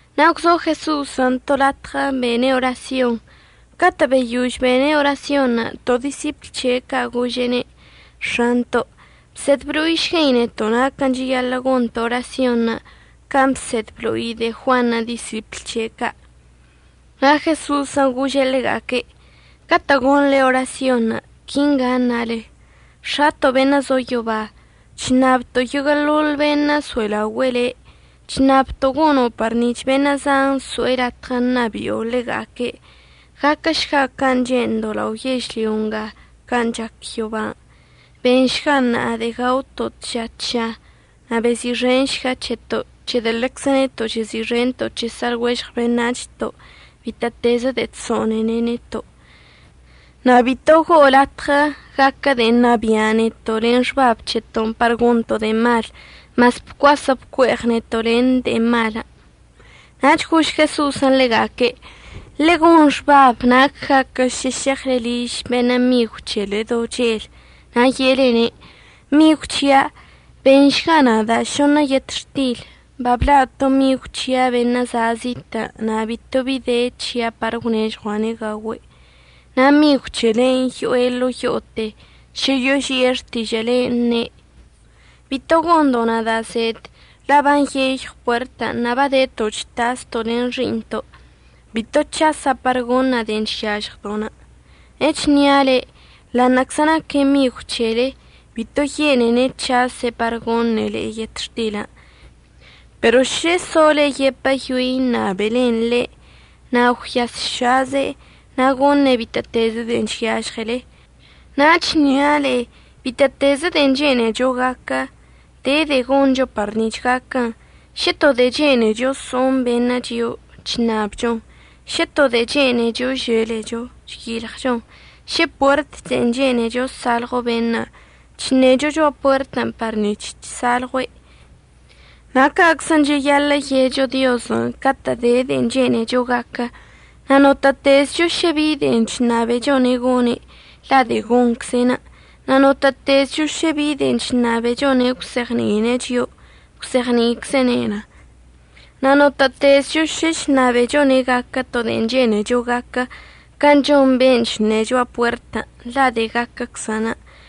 Na' gwzo Jeso'osən' to latɉə bene' orasyon. Catə' beyož bene' orasyonṉə' to disipl c̱he' ca' gože'ene': ―X̱anto', bsed blo'išguei neto' naquən' cheyaḻə' gonto' orasyonṉə', can' bsed əblo'i de'e Juanṉə' disipl c̱he' ca'. Na' Jeso'osən' gože' ḻega'aque': ―Catə' gonḻe orasyonṉə' quingan' ṉale: X̱ato' beṉə' zo yoba, chṉabto' yoguə'əḻoḻ beṉə' əso'elaogüe'e le'. Chṉabto' gono' par nic̱h beṉə' zan əso'e latɉə ṉabi'o ḻega'aque'. Gaquəšga can' che'endo'onə' lao yežlyo nga can' chac yoban'. Benšga ṉa'a de'e gaoto' tža tža. Na' bezi'ixenšga c̱heto' c̱hedə' ḻeczə neto' chezi'ixento' c̱he sa'alɉuežɉ beṉac̱hto'onə' bitə'ətezə de'e chso'onene' neto'. Na' bito go'o latɉə gaquə de'e ṉabia' neto' len xbab c̱heto'onə' par gonto' de'e malən', mas bcuasə' bcue'eɉ neto' len de'e malən'. Nach gož Jeso'osən' ḻega'aque': ―Ḻegon xbab nac gaquə šə šeɉle liž beṉə' migw c̱hele do chel na' ye'elene': “Migw c̱hia', beṉšga nada' šoṉə yetxtil. Babla' to migw c̱hia' beṉə' za' zitə', na' bito bi de c̱hia' par əgwnežɉua'ane' gaogüe'.” Na' migw c̱helen' yo'e ḻo'o yo'ote šə yoži'e xtižə'əlen', əṉe': “Bito gondo' nada' zed, la' banyeyɉw puertən' na' badeto' chtasto' len xi'iṉto'. Bito c̱hasa' par goṉa' de'en chyažɉdo'.” Echnia' le'e, ḻa'aṉə'əczə naque' migw c̱hele bito yene'ene' c̱hase' par goṉe' le'e yetxtilən', pero šə sole yepəyoe ṉabelen ḻe' na' gwyasšaze' na' goṉe' bitə'ətezə de'en chyažɉele. Na' chnia' le'e, bitə'ətezə de'en chene'echo gaquə, de de'e goncho par nic̱h gaquən. Šə to de'e chene'echo so'oṉ beṉə' chio'o, chṉabchon. Šə to de'e chene'echo əželecho, chyilɉchon. Šə puert de'en chene'echo əsalɉo beṉə', chṉecho cho'a puertən' par nic̱h chsalɉue'. Na' ca'aczən' cheyaḻə' ye'echo Diozən' catə'ən de de'en chene'echo gaquə. Na' notə'ətezcho šə bi de'en chṉabechone' goṉe', la' de'e goṉcze'enə'. Na' notə'ətezcho šə bi de'en chṉabechone' əgwzeɉni'ine' chio'o, gwzeɉni'iczene'en. Na' notə'ətezcho šə chṉabechone' gaquə to de'en chene'echo gaquə can' chon beṉə' chṉe' cho'a puertən', la' de'e gaquəczən'.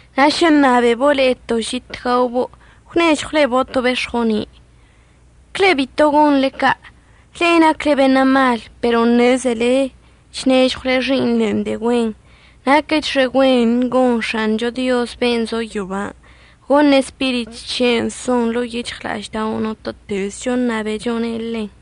Na' šə əṉabebo' le'e to žit gaobo' ¿əgwnežɉwlebo' to bex̱goni'? Cle bito gonḻe ca'. Le'e nacle beṉə' mal pero ṉezele chnežɉwle xi'iṉlen' de'e güen. Naquəchxe güen gon X̱acho Diozən' ben' zo yoban' goṉe' Spirit c̱he'enə' son ḻo'o yic̱hɉla'aždao' notə'ətezcho əṉabechone' ḻen.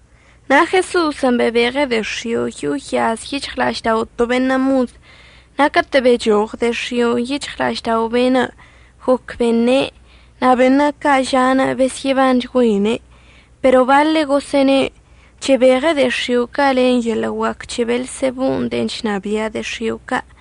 Na' Jeso'osən' bebeɉe' de'e x̱io' yo'o yaz yic̱hɉla'aždao' to beṉə' mod. Na' catə' bechoɉ de'e x̱i'onə' yic̱hɉla'aždao' be'enə', goc beṉe', na' beṉə' ca' ža'anə' besyə'əbanchgüeine'. Pero baḻe' gosə'əne': ―Chebeɉe' de'e x̱io' ca' len yeḻə' guac c̱he Beelsebo de'en chnabia' de'e x̱io' ca'.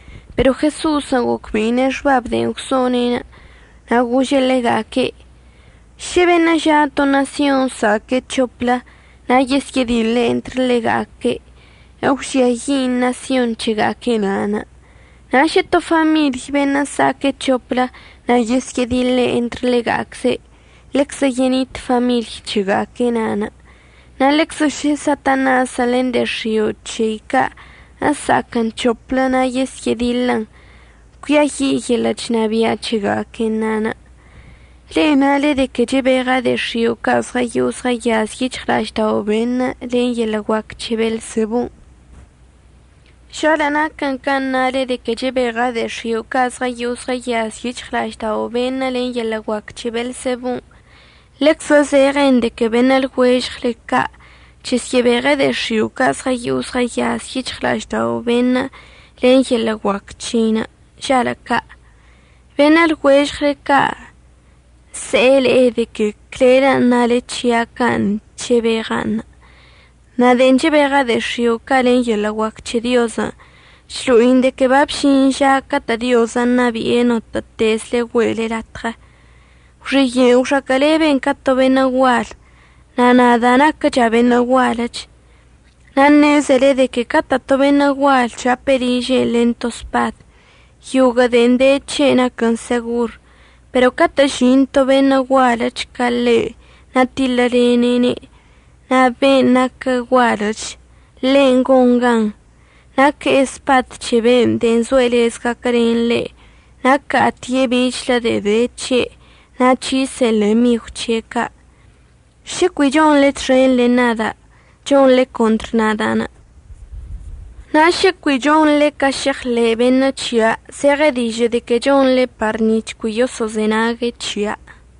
Pero Jeso'osən' gocbe'ine' xbab de'en gwso'one', na' gože' ḻega'aque': ―Šə beṉə' ža' to ṉasyon əsa'aque' c̱hoplə na' yesyə'ədiḻe' entr ḻega'aque', əgwžiayi' ṉasyon c̱hega'aque' na'anə'. Na' šə to famiḻy beṉə' əsa'aque' c̱hoplə na' yesyə'ədiḻe' entr ḻega'acze', ḻeczə yenit famiḻy c̱hega'aque' na'anə'. Na' ḻeczə šə Satanasən' len de'e x̱io' c̱hei ca' əsa'aquən c̱hoplə na' yesyə'ədiḻən, cuiayi' yeḻə' chnabia' c̱hega'aquenṉə'. Le'e nale de que chebeɉa' de'e x̱io' ca' zɉəyo'o zɉəyaz yic̱hɉla'aždao' beṉə' len yeḻə' guac c̱he Beelsebon'. Žalə' naquən can' nale de que chebeɉa' de'e x̱io' ca' zɉəyo'o zɉəyaz yic̱hɉla'aždao' beṉə' len yeḻə' guac c̱he Beelsebon', ḻeczə zeɉen de que beṉə' lɉuežɉle ca' chəsyə'əbeɉe' de'e x̱io' ca' zɉəyo'o zɉəyaz yic̱hɉla'aždao' beṉə' len yeḻə' guac c̱hein' žalə' ca'. Beṉə' lɉuežɉle ca' se'e le'e de que clelən' nale c̱hia' can' chebeɉa'anṉə'. Na' de'en chebeɉa' de'e x̱io' ca' len yeḻə' guac c̱he Diozən', chlo'in de que babžin ža catə' Diozən' ṉabi'e notə'ətezle güe'ele latɉə. Gwxiye'enə' gwxaquə'əleben ca to beṉə' gual, na' nada' naquəcha' beṉə' gualəch. Na' ṉezele de que catə' to beṉə' gual chape' ližen' len spad, yoguə' de'en de c̱he' naquən segor. Pero catə' əžin to beṉə' gualəch ca ḻe' na' tiḻəlene'ene', na' ben' naquə gualəch ḻen' gon gan. Na' que'e spad c̱he be'enə' de'en zoe' lez gaquəlenən ḻe'. Na' əca'atie' bichlə de'e de c̱he' na' c̱hise'en len migw c̱he' ca'. Šə cui chonḻe txen len nada' chonḻe contr nada'. Na' šə cui chonḻe ca se'eɉḻe' beṉə' c̱hia', zeɉe dižə' de que chonḻe par nic̱h cui yoso'ozenague' c̱hia'.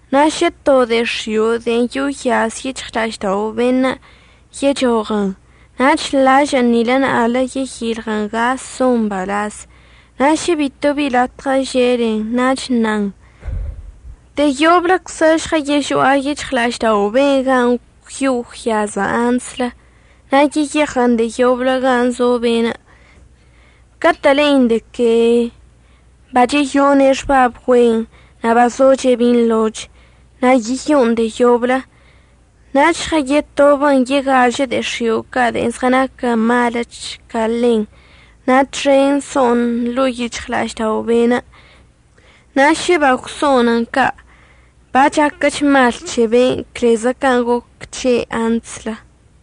Na' šə to de'e x̱io' de'en yo'o yaz yic̱hɉla'aždao' beṉə' yechoɉən nach lažə'ən nil na'aḻə yeyilɉən ga son mbalaz. Na' šə bitobi latɉə želen, nach əṉan: “De'e yobləczə žɉəyežo'a yic̱hɉla'aždao' ben' gan' gwyo'o gwyaza' antslə.” Na' yeyeɉən de'e yoblə gan' zo ben'. Catə' le'in de que bacheyone' xbab güen nach bazoche' binḻoch, na' yeyo'on de'e yoblə. Nach žɉəyetobən yegažə de'e x̱io' ca' de'en zɉənaquə maləch ca ḻen na' txenṉə' so'on ḻo'o yic̱hɉla'aždao' be'enə'. Na' šə bagwso'onən ca' bachaquəch mal c̱he be'enə' clezə can' goc c̱he' antslə.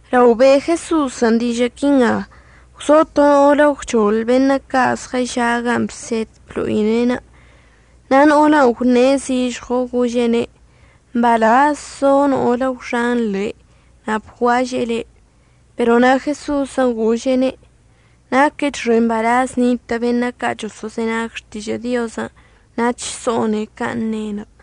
Lao be' Jeso'osən' dižə' quinga, gwzo to no'olə gwchoḻ beṉə' ca' zɉəža' gan' bsed əblo'ine'enə'. Na' no'olən' gwṉe' zižɉo gože'ene': ―Mbalaz zo no'olən' gwxan le' na' bguaže'e le'. Pero na' Jeso'osən' gože'ene': ―Naquəchxe mbalaz nitə' beṉə' ca' choso'ozenag xtižə' Diozən' na' chso'one' can' ne'enə'.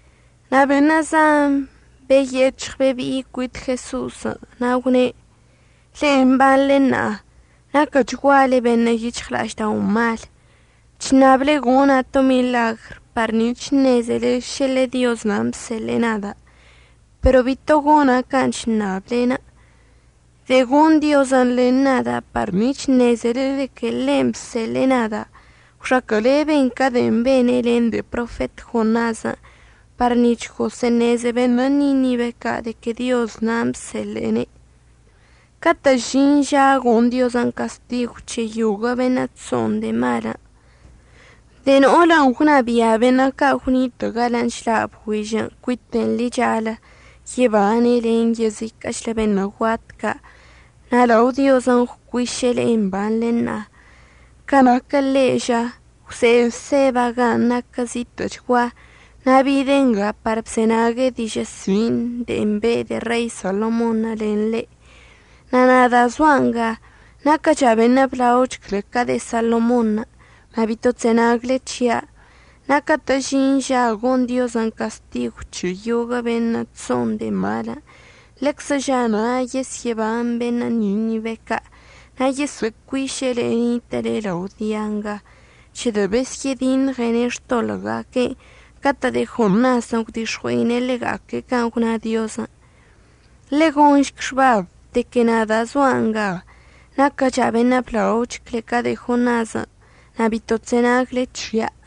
Na' beṉə' zan beyec̱hɉ bebi'i cuit Jeso'osən' na' gwne': ―Le'e mbanḻe ṉa'a naquəchguale beṉə' yic̱hɉla'aždao' mal. Chṉable gona' to miḻagr par nic̱h əṉezele šə ḻe Dioz nan' bseḻe'e nada'. Pero bito gona' can' chṉablenə'. De'e gon Diozən' len nada' par nic̱h əṉezele de que ḻe'enə' bseḻe'e nada' gwxaquə'əleben ca de'en bene' len de'e profet Jonasən' par nic̱h gosə'əṉeze beṉə' Ninibe ca' de que Dioz nan' bseḻe'ene'. Catə' əžin ža gon Diozən' castigw c̱he yoguə' beṉə' chso'on de'e malən', de'e no'olən' gwnabia' beṉə' ca' gwnitə' galən' chḻa' bgüižən' cuiten ḻichalə yebane' len yeziquə'əchlə beṉə' guat ca' na' lao Diozən' gwcuiše' le'e mbanḻe ṉa'a. Ca naquə ḻe' ža, gwze'e Seba gan' naquə zitə'əchgua na' bide' nga par bzenague' dižə' sin' de'en be' de'e Rei Salomonṉə' len ḻe'. Na' nada' zoa' nga naquəcha' beṉə' blaoch cle ca de'e Salomonṉə', na' bito chzenagle c̱hia'. Na' catə' əžin ža gon Diozən' castigw c̱he yoguə' beṉə' chso'on de'e malən', ḻeczə ža na' yesyə'əban beṉə' Ninibe ca'. Na' yesə'əcuiše' le'e nitə'əle lao dia nga c̱hedə' besyə'ədiṉɉene' xtoḻə'əga'aque'enə' catə' de'e Jonasən' gwdix̱ɉue'ine' ḻega'aque' can' gwna Diozən'. Ḻegonšc xbab de que nada' zoa' nga naquəcha' beṉə' blaoch cle ca de'e Jonasən', na' bito chzenagle c̱hia'.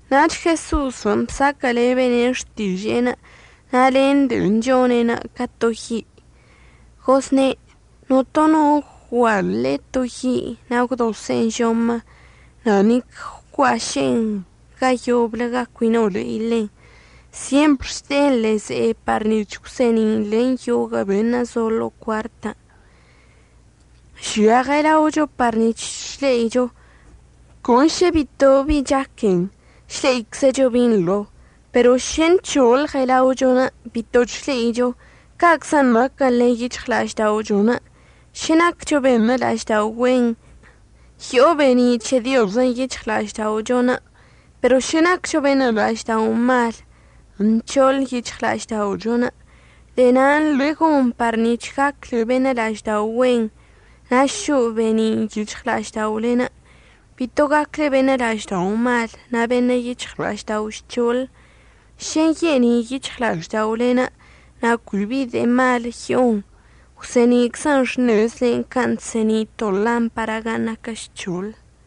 Nach Jeso'osən' bsaquə'əlebene' xtiže'enə' na' len de'en chone'enə' ca to yi'. Gozne': ―Notono no ggualə' to yi' na' gwdose'en žomə, na' nic əgwcuaše'en ga yoblə ga cui no le'i ḻen. Syempr chde'en ḻe'e ze'e par nic̱h əgwse'eni'in len yoguə' beṉə' so'o ḻo'o cuartən'. Žia ɉelaochon' par nic̱h chle'icho. Con šə bito bi chaquen, chle'iczecho binḻo. Pero šə nc̱hoḻ ɉelaochon', bito chle'icho. Ca'aczən' naquən len yic̱hɉla'ažda'ochon'. Šə naccho beṉə' la'aždao' güen, yo'o be'eni' c̱he Diozən' yic̱hɉla'ažda'ochon', pero šə naccho beṉə' la'aždao' mal, nc̱hoḻ yic̱hɉla'ažda'ochon'. De'e na'anə' ḻegon par nic̱h gacle beṉə' la'aždao' güen, na' šo'o be'enin' yic̱hɉla'ažda'olen'. Bito gacle beṉə' la'aždao' mal na' beṉə' yic̱hɉla'aždao' žc̱hoḻ. Šə nye'eni' yic̱hɉla'ažda'olen' na' cui bi de'e mal yo'on, gwse'eni'iczən xṉezlen' can' chse'eni' to lampara gan' naquə žc̱hoḻ.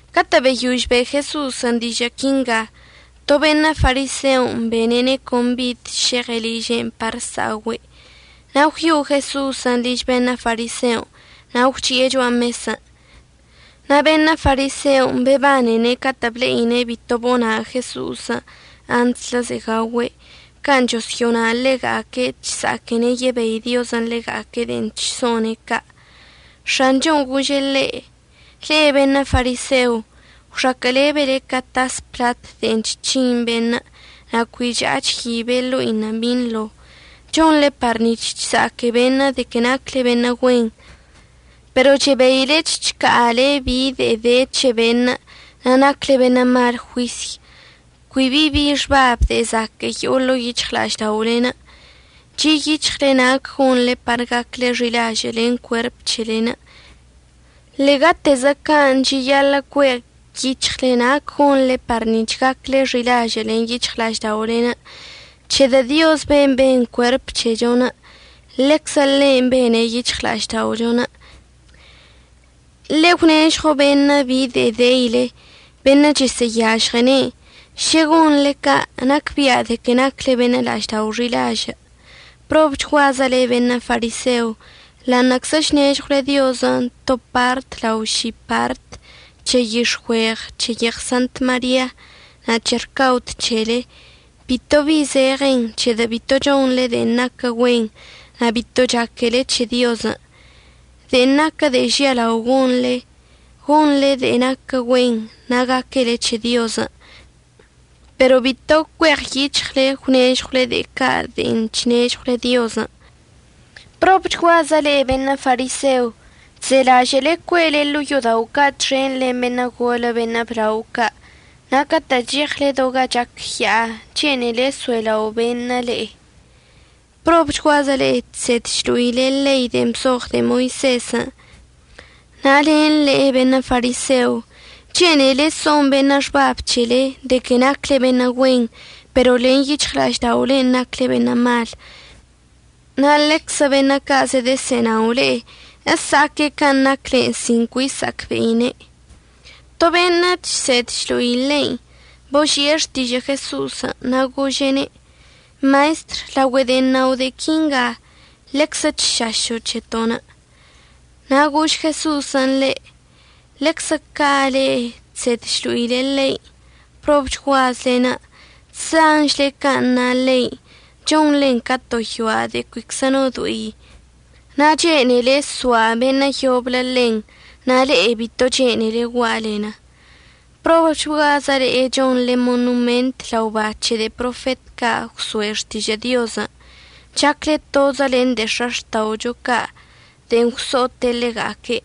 Catə' beyož be' Jeso'osən' dižə' quinga, to beṉə' fariseo bene'ene' combid šeɉe' liže'en par əsa'ogüe'. Na' gwyo'o Jeso'osən' liž beṉə' fariseon' na' gwchi'e cho'a mesən'. Na' beṉə' fariseon' bebanene' catə' ble'ine' bito bona' Jeso'osən' antslə ze'e gaogüe' can' chosyo'ona' ḻega'aque' chsa'aquene' yebei Diozən' ḻega'aque' de'en chso'one' ca'. X̱anchon' gože' ḻe': ―Le'e beṉə' fariseo gwxaquə'əlebele ca tas plat de'en chc̱hin beṉə' na' cui cha'a chyibe' ḻo'inə' binḻo. Chonḻe par nic̱h chsa'aque beṉə' de que nacle beṉə' güen, pero chebeile chca'ale bi de'e de c̱he beṉə' na' nacle beṉə' mal juisy. Cui bi bi xbab de'e zaque'e yo'o ḻo'o yic̱hɉla'ažda'olen'. Chi' yic̱hɉle nac gonḻe par gacle xi'ilažə' len cuerp c̱hele. Ḻe'egatezə ca' cheyaḻə' cue' yic̱hɉle nac gonḻe par gacle xi'ilažə' len yic̱hɉla'ažda'olen', c̱hedə' Diozən' ben' ben cuerp c̱hechon' ḻeczə ḻe'enə' bene' yic̱hɉla'ažda'ochon'. Ḻe'e gwnežɉo beṉə' bi de'en deile, beṉə' chəsə'əyažɉene'en. Šə gonḻe ca' nacbia' de que nacle beṉə' la'aždao' xi'ilažə'. ¡Probchguazə le'e beṉə' fariseo! Ḻa'aṉə'əczə chnežɉwle Diozən' to part lao ši part c̱he yix̱güeɉ, c̱he yeɉ Sant Maria, nach c̱he rcaod c̱hele, bito bi zeɉen, c̱hedə' bito chonḻe de'en naquə güen na' bito chaquele c̱he Diozən'. De'en naquə de'e žialao gonḻe, gonḻe de'en naquə güen na' gaquele c̱he Diozən'. Pero bito cueɉyic̱hɉle əgwnežɉwle de'e ca' de'en chnežɉwle Diozən'. ¡Probchguazə le'e beṉə' fariseo! Chzelažə'əle cue'ele ḻo'o yo'odao' ca' txen len beṉə' golə beṉə' blao ca' na' catə' cheɉle do gan' chac ya'a chene'ele əso'elao' beṉə' le'e. ¡Probchguazə le'e chsed chlo'ile ḻei de'en bzoɉ de'e Moisezən' na' len le'e beṉə' fariseo! Chene'ele so'on beṉə' xbab c̱hele de que nacle beṉə' güen, pero len yic̱hɉla'ažda'olen' nacle beṉə' mal. Na' ḻeczə beṉə' ca' zedəsə'ənao le'e əsa'aque' can' nacle sin cui sa'acbe'ine'. To beṉə' chsed chlo'i ḻein' boži'e xtižə' Jeso'osən' na' gože'ene': ―Maestr, laogüe de'en nao' de'e quinga ḻeczə chšašo' c̱heto'onə'. Na' gož Jeso'osən' ḻe': ―Ḻeczə ca' le'e chsed chlo'ile ḻein' ¡probchguazlen'! Chzanchle can' na ḻein', chonḻen ca to yoa' de'e cuiczə no do'i na' chene'ele soa' beṉə' yoblə ḻen, na' le'e bito chene'ele gua'alen. ¡Probchguazə le'e chonḻe monoment lao ba c̱he de'e profet ca' gwso'e xtižə' Diozən'! Chacle tozə len de'e x̱axta'ocho ca' de'en gwso'ote' ḻega'aque',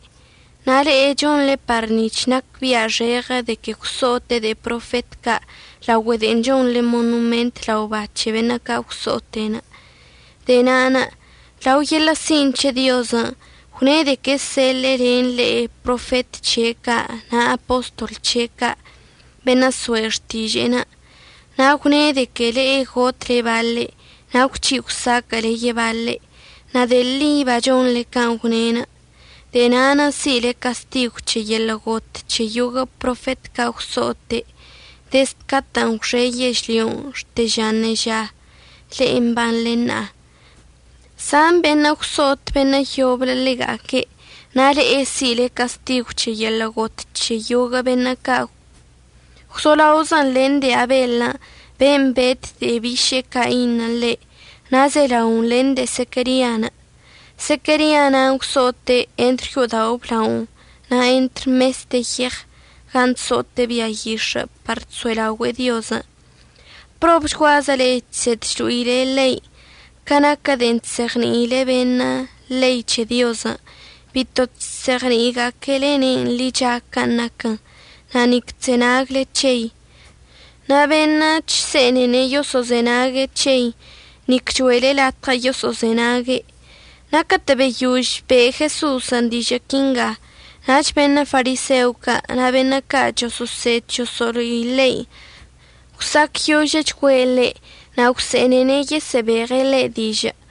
na' le'e chonḻe par nic̱h nacbi'axeɉə de que gwso'ote' de'e profet ca' laogüe de'en chonḻe monoment lao ba c̱he beṉə' ca' gwso'ote'. De'e na'anə' lao yeḻə' sin' c̱he Diozən' gwne' de que əseḻe'e len le'e profet c̱he' ca' na' apostol c̱he' ca', beṉə' so'e xtiže'en. Na' gwne' de que le'e gotle baḻe' na' gwc̱hi' gwsaquə'əle yebaḻe'. Na' de'e ḻi bachonḻe can' gwne'. De'e na'anə' si'ile castigw c̱he yeḻə' got c̱he yoguə' profet ca' gwso'ote' dezd catə'ən gwxe yežlyon' xte ža ṉeža, le'e mbanḻe ṉa'a. Zan beṉə' gwso'ot beṉə' yoblə ḻega'aque'. Na' le'e si'ile castigw c̱he yeḻə' got c̱he yoguə' beṉə' ca' gwzolaozən len de'e Abeḻən' ben' bet de'e biše'e Cainṉə' ḻe' na' zelaon len de'e Zequerian'. Zequeria na'anə' gwso'ote' entr yo'odao' əblaonə' na' entr mes de yeɉ gan' chso'ote' bia yix̱ə' par chso'elaogüe'e Diozən'. ¡Probchguazə le'e chsed chlo'ile ḻein'! Ca naquə de'en chzeɉni'ile beṉə' ḻei c̱he Diozən', bito chzeɉni'iga'aquelene'en ḻicha can' naquən, na' nic chzenagle c̱hei. Na' beṉə' chse'ene'e yoso'ozenag c̱hei, nic cho'ele latɉə yoso'ozenague'. Na' catə' beyož be' Jeso'osən' dižə' quinga, nach beṉə' fariseo ca' na' beṉə' ca' choso'osed choso'olo'i ḻein' gwsa'acyožəchgüe' ḻe' na' gwse'enene' yesə'əbeɉe' ḻe' dižə'.